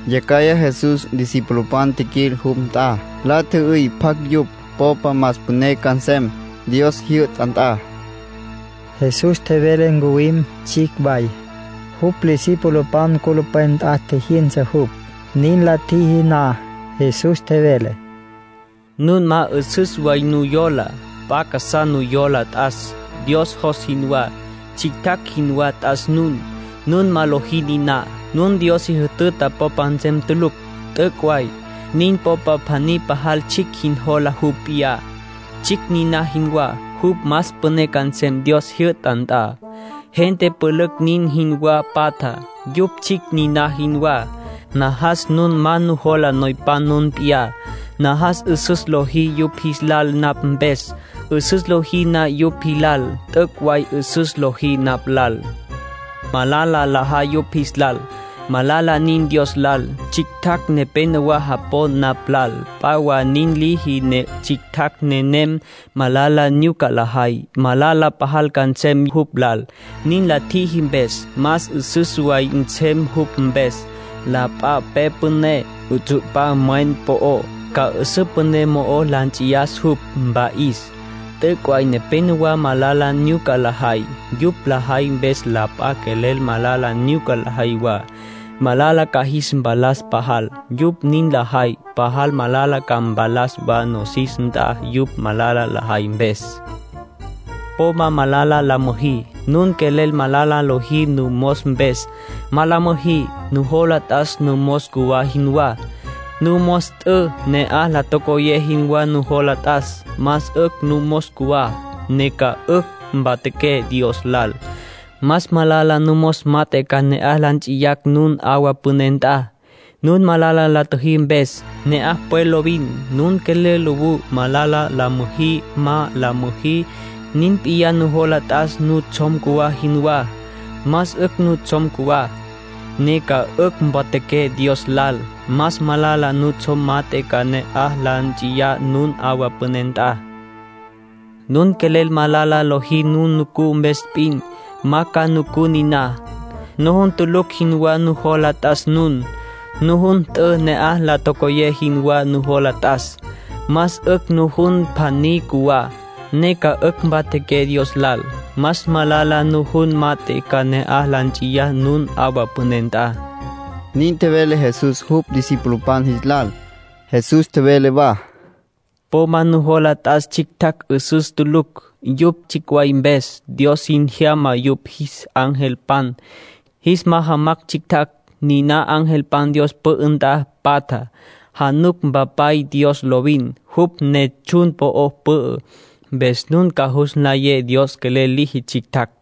Yacjaya Jesús discipulopan tjiquil jupj nt'a. La tjü'üy pjacj yupj popa más püné ca nsem Dios jyü'ta nt'a. Jesús tjevele ncuwim tsjicj way. Jupj discipulopan culupwen nt'a tjijyünsa jupj. Nin la tjiji na, Jesús tjevele: —Nun ma 'üsüs way nujola. P'a casá nujola t'as, Dios jos jinwá. Tsjictjacj jinwá t'as nun. Nun ma lojí niná, nun Dios si jütüta popa nsem tulucj. T'üc' way. Nun popa pjaní pajal tsjicj jin jola jupj p'iyá, tsjicj niná jinwá, jupj más püné ca nsem Dios jyü'ta nt'a. Gente pülücj nin jinwá patja, yupj tsjicj niná jinwá. Najas nun ma nujola noypan nun p'iyá. Najas 'üsüs lojí yupj jilal napj mpes. 'Üsüs lojí na yupj jilal, t'üc' way 'üsüs lojí napj lal. Malala lajay yupj jis lal, malala nin Dios lal. Tsjictjacj nepénowa japon napj lal. P'a wa nin liji ne tsjictjacj nenem malala nyuca lajay, malala pajal ca nsem jupj lal, nin la tjiji mpes. Más 'üsüs way nsem jupj mpes, la p'a pe püné 'utsu'pa mwen po'ó, ca 'üsǘ püné mo'o la nts'iyas jupj, mpa'is. ”T'üc' way nepénowa malala nyuca lajay. Yupj lajay mpes la p'a quelel malala nyuca lajay wa. Malala ca jis mpalas pajal, yupj nin lajay. Pajal malala ca mpalas wa nosis nt'a yupj malala lajay mpes. Po ma malala la müjí. Nun quelel malala lojí numos mpes, ma la müjí. Nujola t'as numos cjuwá jinwá. Numos t'ü, na'aj la tocoyé jinwá nujola t'as. Más 'ücj numos cjuwá, ne ca 'ücj mpatjaqué Dios lal. Más malala numos mat'e ca na'aj la nts'iyacj nun 'awa püné nt'a, nun malala la tjüjí mpes. Ne'aj pwe lovin. Nun quelel lowú, malala la müjí, ma la müjí. Nin p'iyá nujola t'as nutsjom cjuwá jinwá. Más 'ücj nutsjom cjuwá, ne ca 'ücj mpatjaqué Dios lal. Más malala nutsjom mat'e ca na'aj la nts'iyacj nun 'awa püné nt'a. Nun quelel malala lojí nun nucú mpes p'in, ma ca nucú niná. Nujun tulucj jinwá nujola t'as nun. Nujun t'ü, na'aj la tocoyé jinwá nujola t'as. Más 'ücj nujun pjaní cjuwá, ne ca 'ücj mpatjaqué Dios lal. Más malala nujun mat'e ca na'aj la nts'iyacj nun 'awa püné nt'a —nin tjevele Jesús jupj discipulopan jis lal. Jesús tjevele wa: —Po ma nujola t'as tsjictjacj 'üsüs tulucj, yupj tsjicj way mpes. Dios sin jyama yupj jis angelpan, jis majamacj tsjictjacj. Niná angelpan Dios pü'ü nt'a patja. Januc Mpapay Dios lovin, jupj ne tsjun po'ó pü'ü. Mpes nun ca jus cülayé Dios quelel liji tsjictjacj. [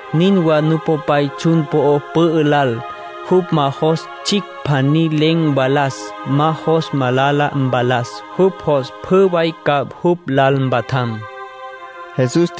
Nin wa Nupopay tsjun po'o pü'ü lal. Jupj ma jos tsjicj pjaní len̈ mvalas. Ma jos malala mpalas. Jupj jos pjü way ca jupj lal mpatjam —nin tjevele Jesús.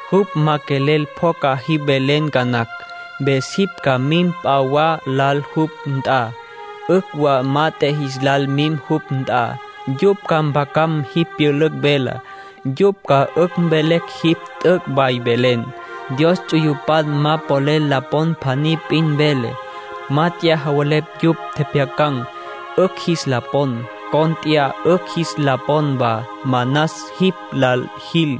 Jupj ma quelel pjoca jipj velen ca nacj, mpes jipj ca mim p'a wa lal jupj nt'a. 'Ücj wa mat'e jis lal mim jupj nt'a. Yupj ca mpjacan̈ jipj pyülücj velá. Yupj ca 'ücj mvelecj jipj t'üc' way velen. Dios ts'uyupan ma polel la pon pjaní p'in vele. ‘Mát'eya javelepj yupj tjepjyacan̈, 'ücj jis la pon. Cónt'eya 'ücj jis la pon wa. Manas jipj lal jil,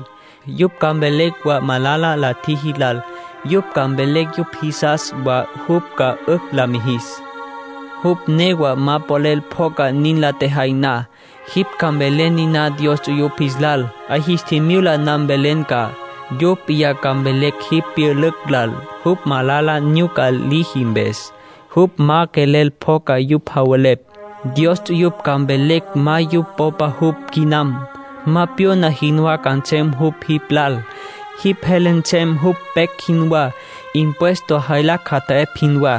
yupj ca mvelecj wa malala la tjiji lal. Yupj ca mvelecj yupj jisas wa jupj ca 'ücj la mijis.’ Jupj newa ma quelel pjoca nin la tjejay na, jipj ca mvelen niná Dios ts'uyupj jis lal. 'A jis tjimyula na mvelen ca. Yupj p'iyá ca mvelecj jipj pyülücj lal, jupj malala nyuca liji mpes. Jupj ma quelel pjoca yupj javelepj, Dios ts'uyupj ca mvelecj ma yupj popa jupj quinam. Ma pyona jinwá ca nsem jupj jipj lal. Jipj jele nsem jupj pecj jinwá, impuesto jaylacj jata'epj jinwá.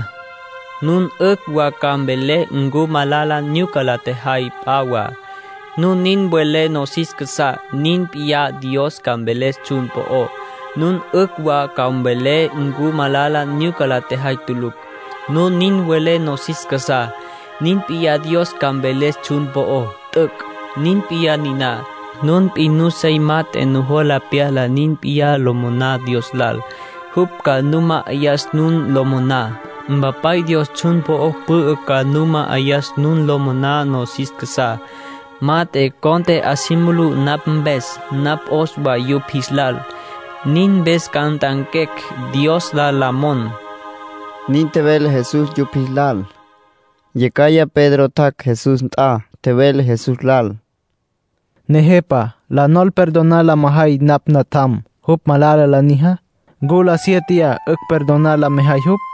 Nun 'ücj wa ca mvelé ncu malala nyuca la tjajay p'a wa. Nun nin welé nosis casá, nin p'iyá Dios ca mveles tsjun po'ó. Nun 'ücj wa ca mvelé ncu malala nyuca la tjajay tulucj. Nun nin welé nosis casá, nin p'iyá Dios ca mveles tsjun po'ó. T'üc'. Nin p'iyá niná: nun p'in nuseya mat'e nujola pyala nin p'iyá lo moná Dios lal, jupj ca nu ma'ayas nun lo moná. Mpapay Dios tsjun po'o pü'ü ca nu ma'ayas nun lo moná nosis casá. Mat'e, cont'e 'a si mulú napj mpes, napj 'os wa yupj jis lal. Nin mpes ca nt'anquecj Dios lal la mon —nin tjevele Jesús yupj jis lal. Yacjaya Pedro tjac' Jesús nt'a. Tjevele Jesús lal: —Nejepa, ¿la nol perdonar la mejay napj natjam, jupj malala la nijá? ¿Ncu la siéteya 'ücj perdonar la mejay jupj?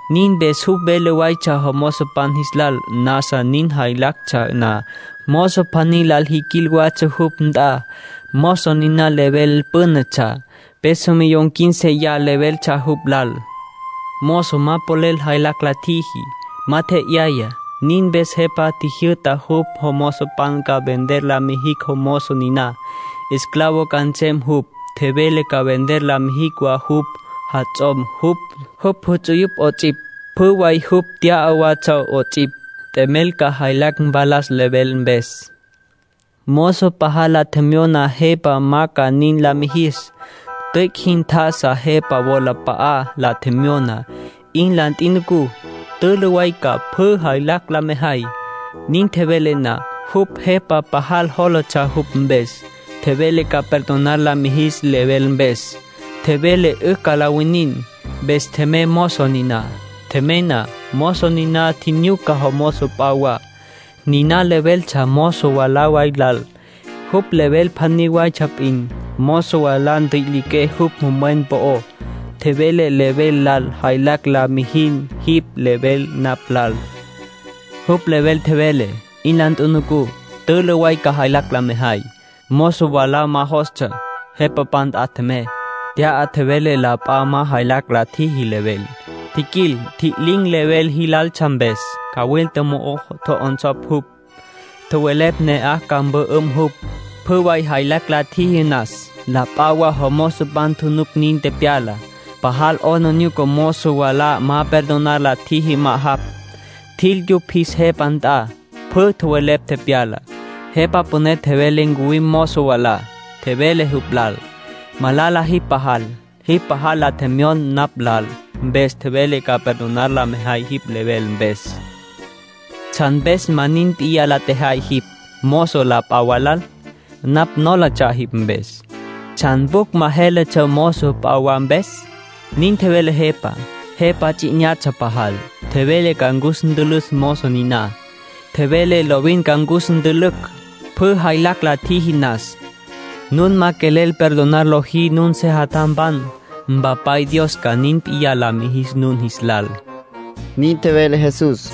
Nin mpes jupj vele watsja jomozopan jis lal. Nasa nin lajaytsja na, mozo pjaní lal jiquil watsja jupj nt'a. Mozo niná level pünetsja. Peso millón quínceya leveltsja jupj lal. Mozo ma polel jaylacj la tjiji, ma tje'yaya. Nin mpes jepa tjijyü'ta jupj jomozopan ca vender la mijicj mozo niná. Esclavo ca nsem jupj. Tjevele ca vender la mijicj wa jupj jats'om, jupj juts'uyupj 'ots'ipj, pjü way jupj tya'a watsja 'ots'ipj. T'emel ca jaylacj mpalas level mpes. Mozo pajal la tjemyona jepa ma ca nin la mijis. Tüic' jin tjá'asa jepa wolap'a'á. La tjemyona: ‘'In la ntjinucú. Tülü way ca jaylacj la mejay pjü.’ Nin tjevele na, jupj jepa pajal jólatsja jupj mpes. Tjevele ca perdonar la mijis level mpes. Tjevele 'ücj la winin. ”Mpes tjemey mozo niná. Tjemey na, mozo niná tjinyuca mozo p'a wa. Niná leveltsja mozo mwalá way lal. Jupj level pjaní waytsja p'in. Mozo mwalá ntjüi'le jupj mwen po'ó. Tjevele level lal: ‘Jaylacj la mijin jipj level napj lal’, Jupj level tjevele: ‘'In la ntjinucú. Tülü way ca jaylacj la mejay’. Mozo mwalá ma jostsja. Jepapan nt'a tjemey. T'ya tjevele la p'a ma jaylacj la tjiji level. Tjiquil, ntji'lin̈ level líjitsja mpes. Cawilta mo'o tjo'onsopj jupj. Tjowelepj ne'aj ca mpü'üm jupj, pjü way jaylacj la tjiji nas. La p'a wa mozopan tjunuc nin tepyalá. Pajal 'aplijílatsja mozo mwalá ma perdonar la tjiji ma'ajapj. Tjil yupj jis jepa nt'a, pjü tjowelepj tepyalá. Jepa püné tjevele ncuwim mozo mwalá. Tjevele jupj lal: ‘Malala jipj pajal. Jipj pajal la tjemyon napj lal, mpes tjevelé ca perdonar la mejay jipj level mpes. ¿Tsjan mpes ma nin p'iyá la tjejay jipj, mozo la p'a wa lal? Napj nólatsja jipj mpes. ¿Tsjan pjucj ma jéletsja mozo p'a wa mpes?’ nin tjevele jepá. Jepa ts'i 'inyatsja pajal. Tjevele ca cus ntülücj mozo niná. Tjevele lovin ca cus ntülücj, pjü jaylacj la tjiji nas. Nun ma quelel perdonar lojí nun sejatjampan, Mpapay Dios ca nin p'iyá la mijis nun jis lal —nin tjevele Jesús.